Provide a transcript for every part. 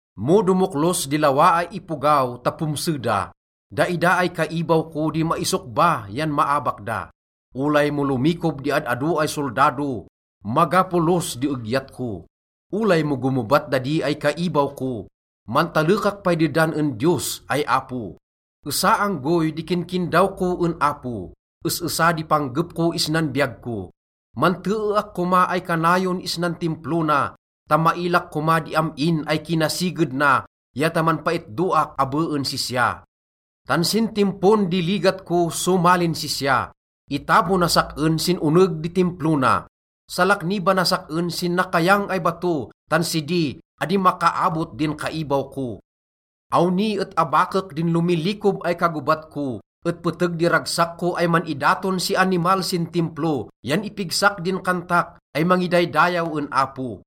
Mo domoklos di lawa ay ipogaw ta pomse da, daida ay kaibaw ko di maisokba yan maabak da. Olay mo lomikob di ad-ado ay soldado, maga polos di egyat ko. Olay mo gomobat dadi ay kaibaw ko, mantalekak pay dedan en Diyos ay Apo. Esa anggoy di kinkindaw ko en Apo, es-esa di panggep ko isnan biyag ko: manteeak koma ay kanayon isnan Timplo na ta mailak koma di am-in ay kinasiged na ya ta manpaitdoak abe en sisya. Tan sin timpon di ligat ko somalin sisya, itabonas sak-en sin oneg di Timplo na. Salaknibanas sak-en sin nakayang ay bato, tan sidi, adi makaabot din kaibaw ko. Awni et abakek din lomilikob ay kagobat ko, et peteg di ragsak ko ay man-idaton si animal sin Timplo yan ipigsak din kantak ay mangidaydayaw en Apo.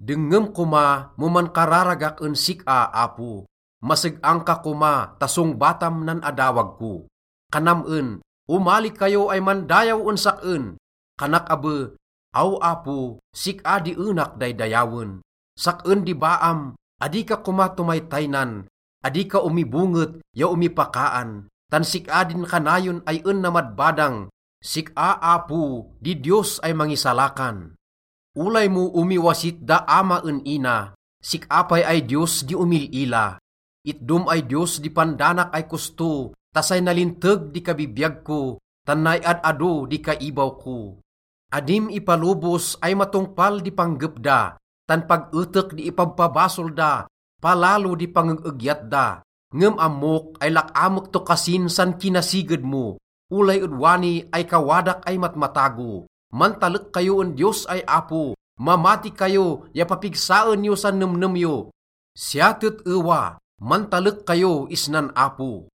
Dengngem koma mo mankararagak en sik-a, Apo. Maseg-ang ka koma ta songbatam nan adawag ko. Kanam en, “Omali kayo ay mandayaw en sak-en.” Kanak abe, “Aw Apo, sik-a di enak daydayawen.” Sak-en di baam, adi ka koma tomaytaynan, adi ka omibonget ya omipakaan, tan sik-a din kanayon ay en namadbadang, sik-a, Apo, di Diyos ay mangisalakan. Olay mo omiwasit da ama en ina, sik-a pay ay Diyos di omil-ila. Itdom ay Diyos di pandanak ay kosto ta say nalinteg di kabibiyag ko, tan nay ad-ado di kaibaw ko. Adim ipalobos ay matongpal di panggep da, tan pag etek di ipabpabasol da, palalo di pangeg-egyat da. Ngem ammok ay lak-amek to kasin san kinasiged mo, olay ed wani ay kawadak ay matmatago. Mantalek kayo en Diyos ay Apo, mamati kayo ya papigsaen yo san nemnem yo. Siya tet-ewa, mantalek kayo isnan Apo.